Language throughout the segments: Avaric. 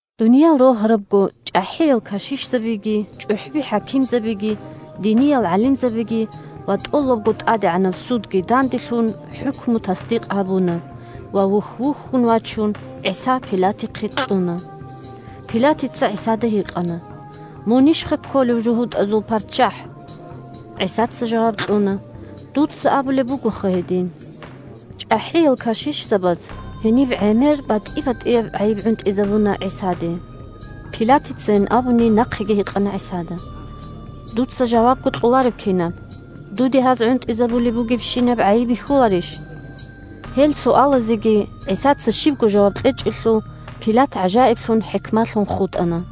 Дуниял рогьарабго, чӀахӀиял кашишзабиги, чӀухӀби-хӀакимзабиги, диниял гӀалимзабиги ва тӀолабго тӀадегӀанаб судги данделъун хӀукму тасдикъ гьабуна ва, вухь-вухьун вачун, ГӀиса Пилатихъе кьуна. Пилатица ГӀисада гьикъана: – Мунищха кколев жугьутӀазул парччахӀ? ГӀисаца жаваб кьуна: – Дуца абулеб бугоха гьедин. ЧӀахӀиял кашишзабаз гьениб гӀемер батӀи-батӀияб гӀайиб гӀунтӀизабуна ГӀисаде. Пилатицайин абуни нахъеги гьикъана ГӀисада: – Дуца жавабго кьолареб кинаб? Дуде гьаз гӀунтӀизабулеб бугебщинаб гӀайиб бихьуларищ? Гьел суалазеги ГӀисаца щибго жаваб кьечӀелъул, Пилат гӀажаиблъун-хӀикмалъун хутӀана.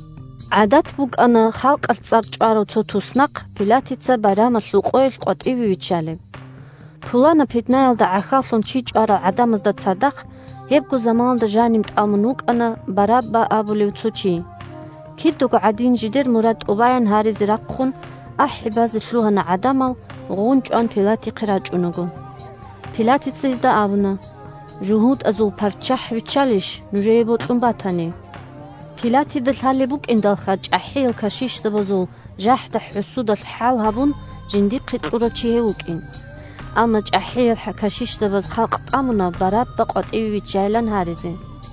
ГӀадат букӀана халкъалъ цӀар чӀварав цо туснахъ Пилатица байрамалъул къоялъ къватӀиве виччалеб. Пуланаб питнаялда гӀахьаллъун чи чӀварал гӀадамазда цадахъ гьебго заманалда жанив тӀамун вукӀана Барабба абулев цо чи. Кидаго гӀадин жидер мурад тӀубаян гьаризе рахъун ахӀи базе лъугьана гӀадамал, гъун-чӀван Пилатихъе рачӀунаго. Пилатица гьезда абуна: – ЖугьутӀазул парччахӀ виччалищ, нужее бокьун батани? (Пилатида лъалеб букӀиндалха чӀахӀиял кашишзабазул жахӀда-хӀусудалъ хӀал гьабун жиндихъе кьурав чи гьев вукӀин.) Амма чӀахӀиял кашишзабаз халкъ тӀамуна Барабба къватӀиве виччайилан гьаризе.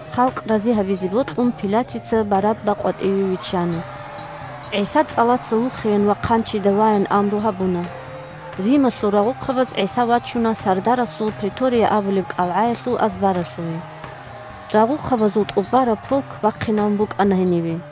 Халкъ рази гьабизе бокьун, Пилатица Барабба къватӀиве виччана. ГӀиса цӀалаца вухеян ва хъанчида ваян амру гьабуна. Рималъул рагъухъабаз ГӀиса вачуна сардарасул претория абулеб кӀалгӀаялъул азбаралъуве. Рагъухъабазул тӀубараб полк бахъинабун букӀана гьенибе.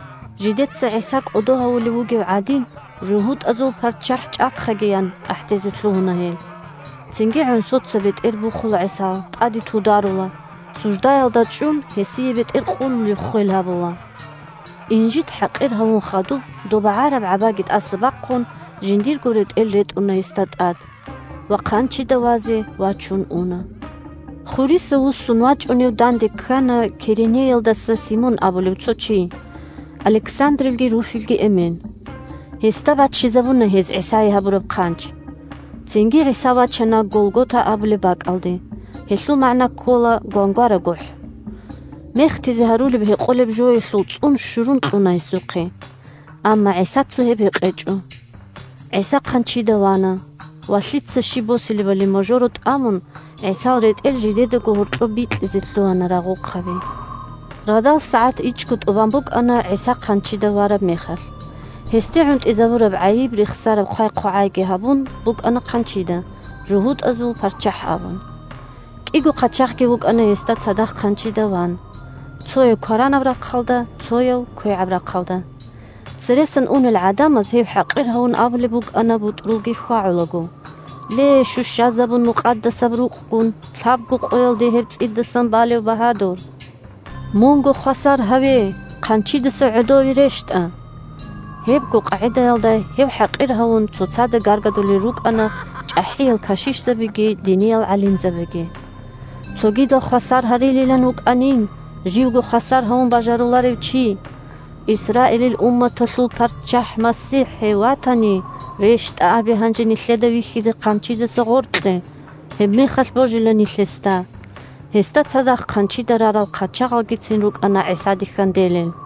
Жидеца ГӀиса кӀодо гьавулев вугев гӀадин: – ЖугьутӀазул парччахӀ чӀахъаги! – ян ахӀдезе лъугьуна гьел. Цинги гӀонсоца бетӀер бухула ГӀисал, тӀаде тударула, суждаялда чӀун, гьесие бетӀер къулулеб ххвел гьабула. Инжит-хӀакъир гьавун хадуб, доб багӀараб гӀабаги тӀаса бахъун, жиндирго ретӀел ретӀуна гьесда тӀад. Ва хъанчида вазе вачун уна. Хуриса вуссун вачӀунев данде ккана Киренеялдаса Симон абулев цо чи – Александрилги Руфилги эмен. Гьесда баччизабуна гьез ГӀисае гьабураб хъанч. Цинги ГӀиса вачана Голгота абулеб бакӀалде. Гьелъул магӀна ккола «Гвангвара гохӀ». Мехтизе гьарулеб гьекъолеб жоялъул цӀун щурун кьуна гьесухъе. Амма ГӀисаца гьеб гьекъечӀо. ГӀиса хъанчида вана, ва лъица щиб босилебали можоро тӀамун, ГӀисал ретӀел жидедаго гьоркьоб бикьизе лъугьана рагъухъаби. Радал сагӀат ичӀго тӀубан букӀана ГӀиса хъанчида вараб мехалъ. Гьесде гӀунтӀизабураб гӀайиб рехсараб хъвай-хъвагӀайги гьабун букӀана хъанчида, «ЖугьутӀазул парччахӀ» абун. КӀиго хъачагъги вукӀана гьесда цадахъ хъанчида ван: цояв кваранаб рахъалда, цояв квегӀаб рахъалда. Цересан унел гӀадамаз, гьев хӀакъир гьавун, абулеб букӀана бутӀрулги хьвагӀулаго: – Ле, щущазабун Мукъадасаб Рукъгун, лъабго къоялде гьеб цӀидасан балев багьадур! Мунго хвасар гьаве! Хъанчидаса гӀодове рещтӀа! Гьебго къагӀидаялда гьев хӀакъир гьавун, цоцазда гаргадулел рукӀана чӀахӀиял кашишзабиги диниял гӀалимзабиги: – Цогидал хвасар гьарилилан вукӀанин, живго хвасар гьавун бажаруларев чи! Исраилил умматалъул парччахӀ – МасихӀ гьев ватани, рещтӀа абе гьанже нилъеда вихьизе хъанчидаса гъоркье, гьебмехалъ божила нилъ гьесда. Гьесда цадахъ хъанчида рарал хъачагъалгицин рукӀана ГӀисаде хьанделел.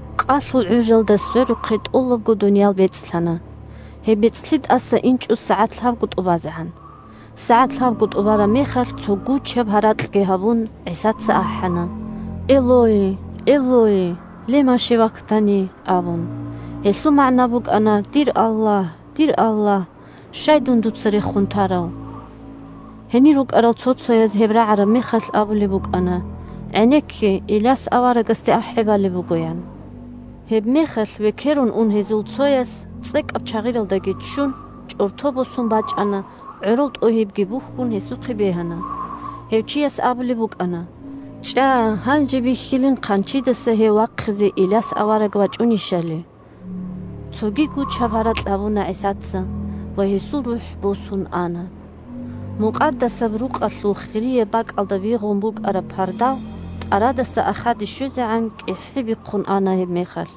Къалъул гӀужалда сверухъе тӀолабго дуниял бецӀлъана. Гьеб бецӀлъи тӀаса инчӀо сагӀат лъабго тӀубазегӀан. СагӀат лъабго тӀубараб мехалъ, цо гучаб гьаракьги гьабун, ГӀисаца ахӀана: – Элои, Элои! Лема шевактани! – абун. (Гьелъул магӀна букӀана: «Дир Аллагь! Дир Аллагь! Щай дуца дун рехун тарав?») Гьенир рукӀарал цо-цояз, гьеб рагӀараб мехалъ, абулеб букӀана: «ГӀенекке, Иляс аварагасде ахӀи балеб буго!» – ян. Гьебмехалъ векерун ун гьезул цояс, цӀекӀаб чагъиралдаги ччун, чӀорто босун бачӀана, гӀорол тӀогьибги бухьун, гьесухъе бегьана. Гьев чияс абулеб букӀана: – ЧӀа, гьанже бихьилин хъанчидаса гьев вахъизе Иляс авараг вачӀунищали. Цоги гучаб гьаракь гьабуна ГӀисаца. Ва гьесул рухӀ босун ана. Мукъадасаб Рукъалъул хирияб бакӀалда бигъун букӀараб пардав тӀарадаса ахаде щвезегӀан кӀихӀи бихъун ана гьебмехалъ.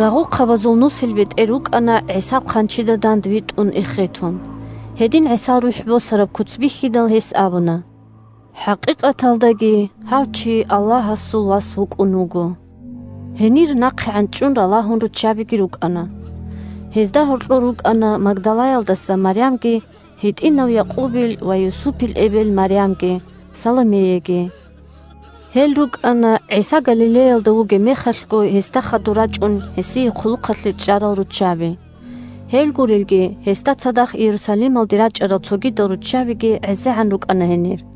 Рагъухъабазул нусилбетӀер вукӀана ГӀисал хъанчида дандвитӀун эхетун. Гьедин ГӀисал рухӀ босараб куц бихьидал, гьес абуна: – ХӀакъикъаталдаги гьав чи Аллагьасул Вас вукӀун вуго. Гьенир нахъегӀан чӀун ралагьун руччабиги рукӀана. Гьезда гьоркьор рукӀана Магдалаялдаса Марямги, гьитӀинав Якъубил ва Юсупил эбел Марямги, Саломеяги. Гьел рукӀана ГӀиса Галилеялда вугеб мехалъго гьесда хадур рачӀун, гьесие хъулухъалъе чӀарал руччаби. Гьел гурелги, гьесда цадахъ Иерусалималде рачӀарал цогидал руччабиги гӀезегӀан рукӀана гьенир.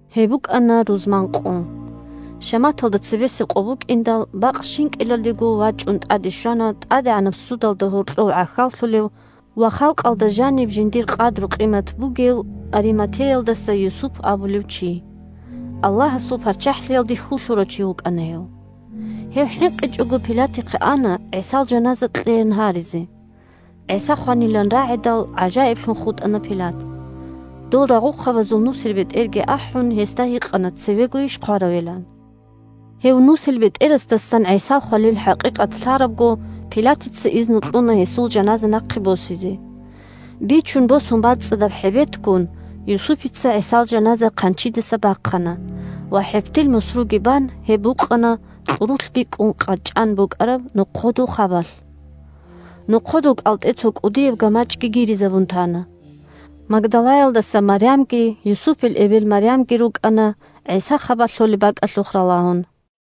Гьеб букӀана рузман къо. Шаматалда цебесеб къо букӀиндал, бакъ щинкӀилалдего вачӀун тӀаде щвана тӀадегӀанаб судалда гьоркьов гӀахьаллъулев ва халкъалда жаниб жиндир къадру-къимат бугев Ариматеялдаса Юсуп абулев чи. (Аллагьасул ПарччахӀлъиялде хьул лъурав чи вукӀана гьев.) Гьев хӀинкъичӀого Пилатихъе ана ГӀисал жаназа кьеян гьаризе. ГӀиса хванилан рагӀидал, гӀажаиблъун хутӀана Пилат. Дол рагъухъабазул нусилбетӀерги ахӀун, гьесда гьикъана цевегойищ хваравилан. Гьев нусилбетӀерасдасан ГӀисал хвалил хӀакъикъат лъарабго, Пилатица изну кьуна гьесул жаназа нахъе босизе. Бичун босун бацӀцӀадаб хӀебетгун, Юсупица ГӀисал жаназа хъанчидаса бахъана ва, хӀебтил мусруги бан, гьеб букъана кьурулъ бикӀун къачӀан букӀараб нохъодул хабалъ. Нохъодул кӀалтӀе цо кӀудияб гамачӀги гиризабун тана. Магдалаялдаса Марямги Юсупил эбел Марямги рукӀана ГӀиса хабалъ лъолеб бакӀалъухъ ралагьун.